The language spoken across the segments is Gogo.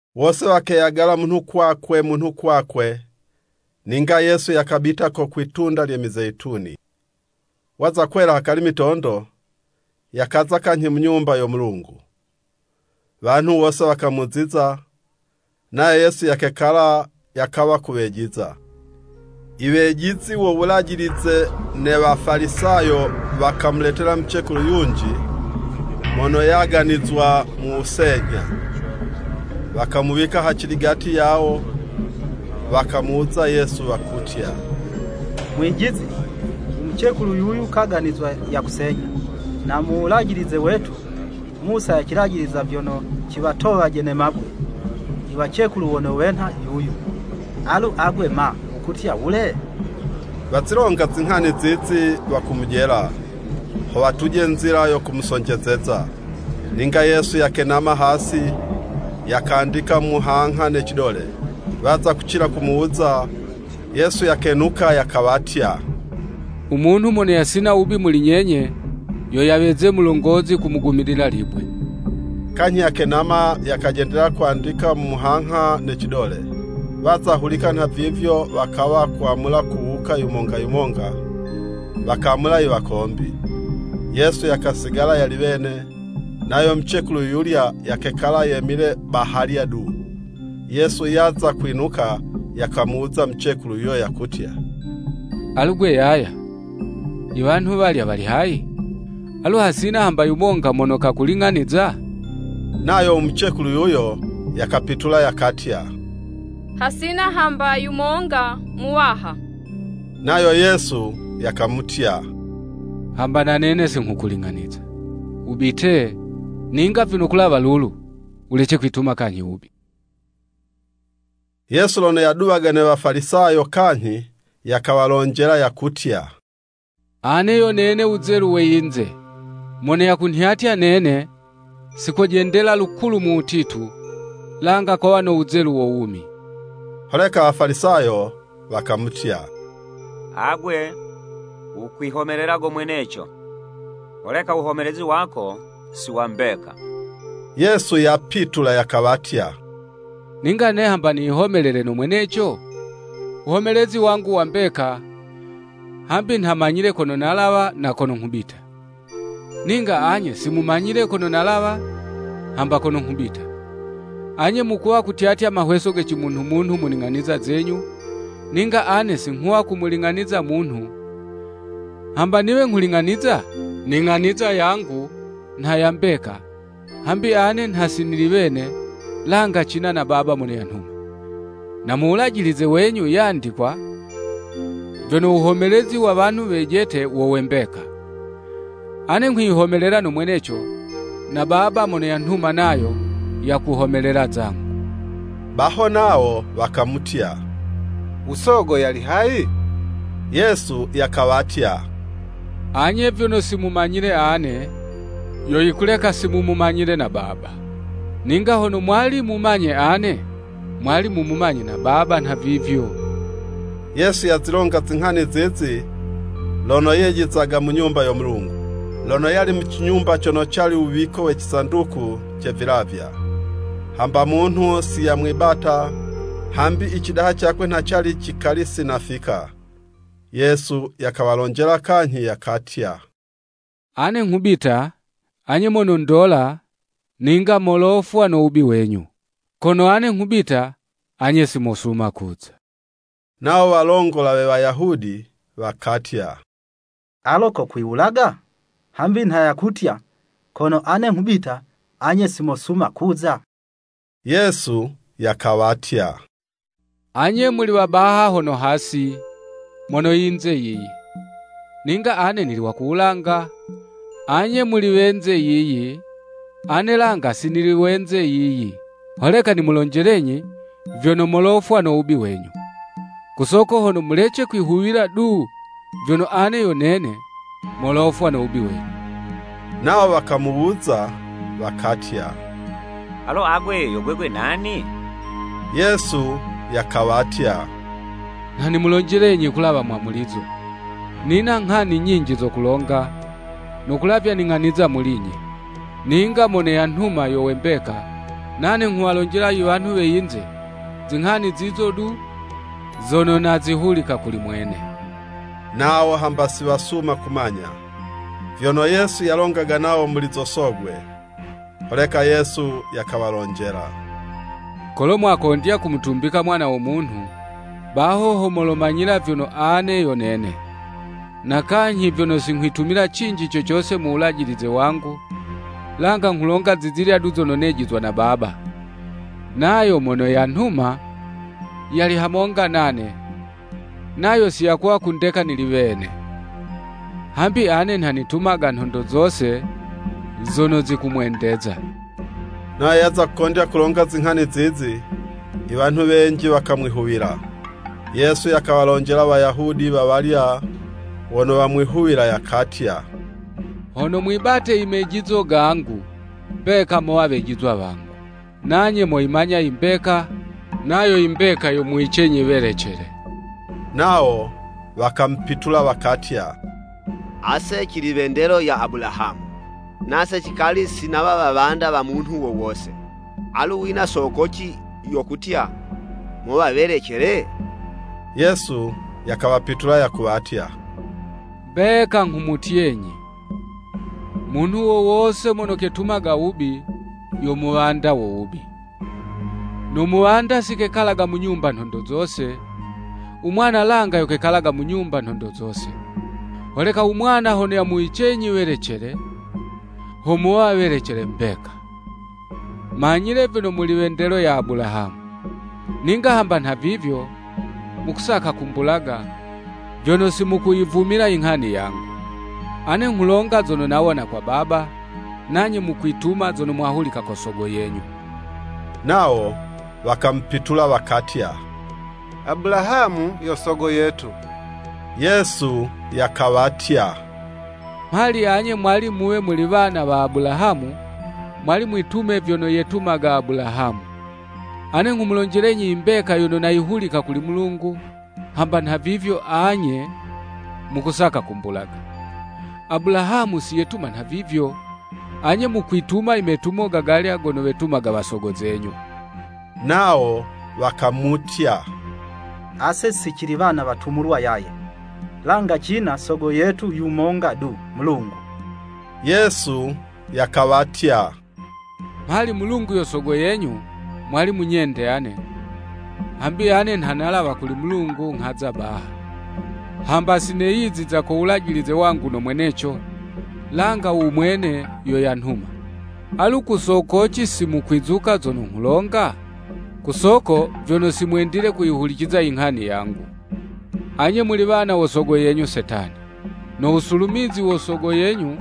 Wose wakeyagala munhu kwakwe munhu kwakwe, ninga Yesu yakabita ku kwitunda lye Mizeyituni. Waza kwela hakali mitondo, yakaza kanyhi mu Nyumba yo Mulungu. Wanhu wose wakamuziza, nayo Yesu yakekala yakawa kuwejiza. Iwejizi wo Wulajilize ne Wafalisayo, wakamuleta mucekulu yunji mono yaganizwa mu wusenyha. Wakamuwika haciligati yawo. Wakamuwuza Yesu wakutya, “Mwijizi! U mucekulu yuyu kaganizwa yakusenyha. Na mu Wulajilize wetu, Musa yacilajiliza vyono ciwatowaje ne mabwe i wacekulu wono wenha yuyu. Alu agwe ma, wukutya wule?” Wazilonga zinghani zizi wakumujela, ho watuje nzila yo kumusonjezeza. Ninga Yesu yakenama hasi, yakandika mu muhangha ne cidole. Waza kucila kumuwuza, Yesu yakenuka yakawatya, “U munhu mono yasina wubi muli nyenye yo yaweze mulongozi kumugumilila libwe.” Kanyhi yakenama yakajendelela kwandika mu muhangha ne cidole. Waza hulika nhavivyo, wakawa kwamula kuwuka yumonga yumonga, wakamula i wakombi. Yesu yakasigala yali wene, nayo mucekulu yuyulya yakekala yemile bahalya du. Yesu yaza kwinuka, yakamuwuza mucekulu yuyo yakutya, “Alu 'gwe yaya, iwanhu walya wali hayi? Alu hasina hamba yumonga mono kakuling'aniza?” Nayo u mucekulu yuyo yakapitula yakatya, “Hasina hamba yumonga Muwaha!” Nayo Yesu yakamutya, “Hamba na nene si nghukuling'aniza. Wubite, ninga vyono kulawa lulu, wulece kwituma kanyhi wubi.”] Yesu lono yaduwaga ne Wafalisayo kanyhi, yakawalonjela, yakutya, “Ane yo nene wuzelu we yinze. Mono yakunhyatya nene, si kojendela lukulu mu wutitu, langa kowa no wuzelu wo wumi.” Holeka Wafalisayo wakamutya, “Agwe wukwihomelela go mweneco, holeka wuhomelezi wako si wa mbeka.” Yesu yapitula yakawatya, “Ninga ane hamba niyihomelele no mweneco, wuhomelezi wangu wa mbeka, hambi nha manyile kono nalawa, na kono nghubita. Ninga anye si mumanyile kono nalawa, hamba kono nghubita. Anye mukuwa kutyatya mahweso ge cimunhu-munhu mu ning'aniza zenyu, ninga ane si nghuwa kumuling'aniza munhu. Hamba niwe nghuling'aniza, ning'aniza yangu nha ya mbeka, hambi ane nha si nili wene, langa cina na Baba mono yanhuma. Na mu Wulajilize wenyu yandikwa vyono, wuhomelezi wa wanhu wejete wo we mbeka. Ane nghwiyihomelela no mweneco, na Baba mono yanhuma nayo yakuhomelela zangu.” Baho nawo wakamutya, “U Sogo yali hayi?” Yesu yakawatya, “Anye vyono si mumanyile ane, yo yikuleka si mumumanyile na Baba. Ninga hono mwali mumanye ane, mwali mumumanye na Baba nhavivyo.” Yesu yazilonga zinghani zizi lono yejizaga mu Nyumba yo Mulungu, lono yali mu cinyumba cono cali wuwiko we cisanduku ce vilavya. Hamba munhu si yamwibata, hambi i cidaha cakwe nha cali cikali si nafika. Yesu yakawalonjela kanyhi yakatya, “Ane nghubita, anye monondola, ninga molofwa no wubi wenyu. Kono ane nghubita, anye si mosuma kuza.” Nawo walongola we Wayahudi wakatya, “Alo kokwiwulaga?” Hambi nha yakutya, “Kono ane nghubita, anye si mosuma kuza?” Yesu yakawatya, “Anye muli wa baha hono hasi, mono yinze yiyi, ninga ane nili wa ku wulanga, anye muli wenze yiyi, ane langa si nili wenze yiyi.” Holeka nimulonjelenyi vyono, molofwa no wubi wenyu. Ku soko hono mulece kwihuwila du vyono “Ane yo nene.” Molofwa no wubi wenyu. Nawo wakamuwuza wakatya, “Alo agwe yo gwegwe nani?” Yesu yakawatya, “Nha nimulonjelenyi kulawa mwamulizo! Nina nghani nyinji zo kulonga, no kulavya ning'aniza muli'nye. Ninga mono yanhuma yo we mbeka, nane nghuwalonjela iwanhu we yinze, zinghani zizo du, zono nazihulika kuli mwene.” Nawo hamba si wasuma kumanya, vyono Yesu yalongaga nawo muli zo Sogwe. Holeka Yesu yakawalonjela, “Kolo mwakondya kumutumbika Mwana wo Munhu, baho ho molomanyila vyono, ‘Ane yo Nene.’ na kanyhi vyono si nghwitumila cinji co cose mu wulajilize wangu, langa nghulonga zizilya du zono nejizwa na Baba. Nayo mono yanhuma, yali hamonga nane. Nayo si yakuwa kundeka nili wene. Hambi ane nha nitumaga nhondo zose zono zikumwendeza.” Nayo yaza kukondya kulonga zinghani zizi, iwanhu wenji wakamwihuwila. Yesu yakawalonjela Wayahudi wawalya wono wamwihuwila, yakatya, “Hono mwibate i mejizo gangu, mbeka mowa wejizwa wangu. Nanye moyimanya i mbeka, nayo i mbeka yomuwicenyi welecele.” Nawo wakamupitula wakatya, “Ase cili we ndelo ya Abulahamu, nase cikali si nawa wawanda wa munhu wo wose.” Alu wina sokoci yo kutya, “Mowa welecele?” Yesu yakawapitula yakuwatya, “Mbeka nghumutyenyi, munhu wo wose mono ketumaga wubi, yo muwanda wo wubi. No muwanda si kekalaga mu nyumba nhondo zose, u mwana langa yo kekalaga mu nyumba nhondo zose. Holeka u Mwana hono yamuwicenyi welecele, ho mowa welecele mbeka. Manyile vyono muli we ndelo ya Abulahamu. Ninga hamba nhavivyo, mukusaka kumbulaga, vyono si mukuyivumila i nghani yangu. Ane nghulonga zono nawona kwa Baba, nanye mukwituma zono mwahulika ko sogo yenyu.” Nawo wakamupitula wakatya, “Abulahamu, yo sogo yetu.” Yesu yakawatya, “Mhali anye mwali muwe muli wana wa Abulahamu, mwali mwitume vyono yetumaga Abulahamu. Ane nghumulonjelenyi imbeka yono nayihulika kuli Mulungu, hamba nhavivyo anye mukusaka kumbulaga. Abulahamu siyetuma nhavivyo. Anye mukwituma i metumo ga galya gono wetumaga wasogo zenyu.” Nawo wakamutya, “Ase si cili wana watumulwa yaye, langa cina sogo yetu yumonga du, Mulungu.” Yesu yakawatya, “Mhali Mulungu yo Sogo yenyu, mwali munyende ane, hambi ane nha nalawa kuli Mulungu nghaza baha. Hamba si neyiziza ko wulajilize wangu no mweneco, langa umwene yo yanhuma. Alu ku sokoci si mukwizuka zono nghulonga? Ku soko vyono si mwendile kuyihuliciza inghani yangu. Anye muli wana wo sogo yenyu Setani, no wusulumizi wa yuyo sogo yenyu,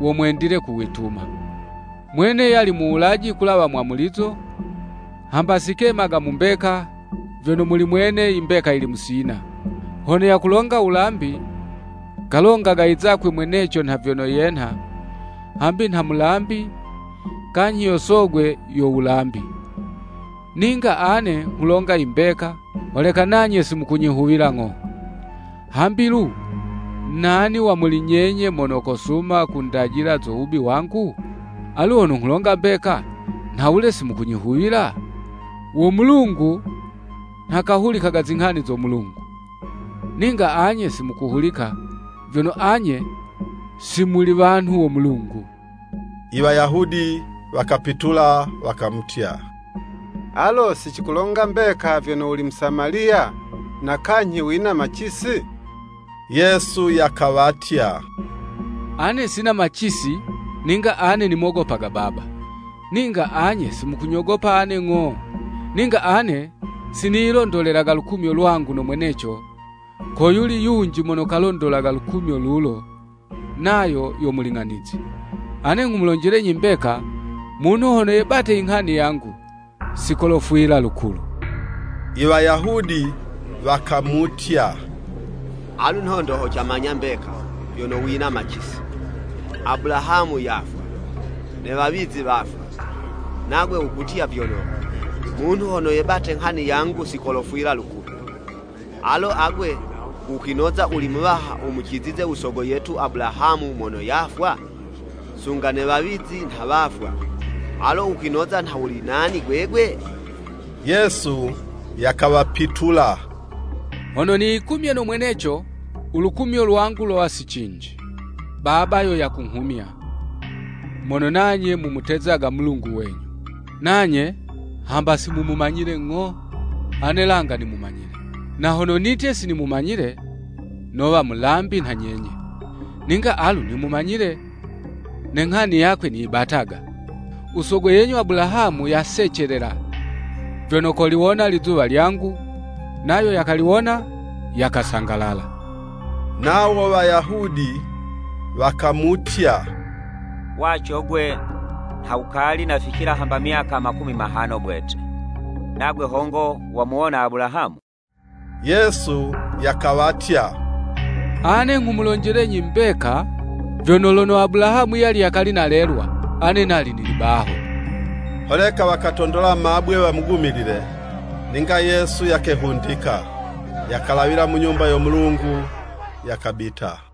wo mwendile kuwituma. Mwene yali muwulaji kulawa mwamulizo, hamba si kemaga mu mbeka, vyono muli mwene, imbeka yili musina. Hono yakulonga wulambi, kalongaga i zakwe mweneco, nha vyono yenha, hambi nha mulambi, kanyhi yo sogwe yo wulambi. Ninga ane nghulonga imbeka, holeka nanye si mukunyihuwila ng'o. Hambi lu, nani wa muli nyenye mono kosuma kundajila zo wubi wangu? Alu hono nghulonga mbeka, nhawule si mukunyihuwila? Wo Mulungu nha kahulikaga zinghani zo Mulungu. Ninga anye si mukuhulika, vyono anye, si muli wanhu wo Mulungu.” Iwayahudi wakapitula wakamutya, “Alo si cikulonga mbeka vyono wuli Musamaliya, na kanyhi wina macisi?” Yesu yakawatya, “Ane sina macisi, ninga ane, nimogopaga Baba. Ninga anye si mukunyogopa ane ng'o. Ninga ane si niyilondolelaga lukumyo lwangu no mweneco, ko yuli yunji mono kalondolaga lukumyo lulo, nayo yo Muling'anizi. Ane nghumulonjelenyi mbeka, munhu hono yebate inghani yangu, si kolofwila lukulu.” Iwayahudi wakamutya, “Alu nhondo ho camanya mbeka, vyono wina macisi.” Abulahamu yafwa, ne wawizi wafwa, nagwe wukutya vyono, “Munhu hono yebate nghani yangu si kolofwila lukulu!” Alo agwe, wukwinoza wuli muwaha wumucizize u sogo yetu Abulahamu mono yafwa? Sunga ne wawizi nha wafwa. Alo wukwinoza nha wuli nani gwegwe? Yesu yakawapitula, “Hono niyikumye no mweneco, ulukumyo lwangu lowa si cinji. Baba yo yakunghumya, mono nanye mumutezaga Mulungu wenyu. Nanye hamba si mumumanyile ng'o, ane langa nimumanyile. Na hono nitye si nimumanyile, nowa mulambi nha nyenye. Ninga alu nimumanyile, ne nghani yakwe niyibataga. U sogo yenyu Abulahamu yasecelela, vyono koliwona lizuwa lyangu, nayo yakaliwona, yakasangalala.” Nawo Wayahudi wakamutya, “Waco 'gwe, nha wukali naficila hamba myaka makumi mahano bwete, nagwe hongo wamuwona Abulahamu?” Yesu yakawatya, “Ane nghumulonjelenyi mbeka, vyono, lono Abulahamu yali yakali nalelwa, ane nali nili baho.” Holeka wakatondola mabwe wamugumilile, ninga Yesu yakehundika, yakalawila mu Nyumba yo Mulungu yakabita.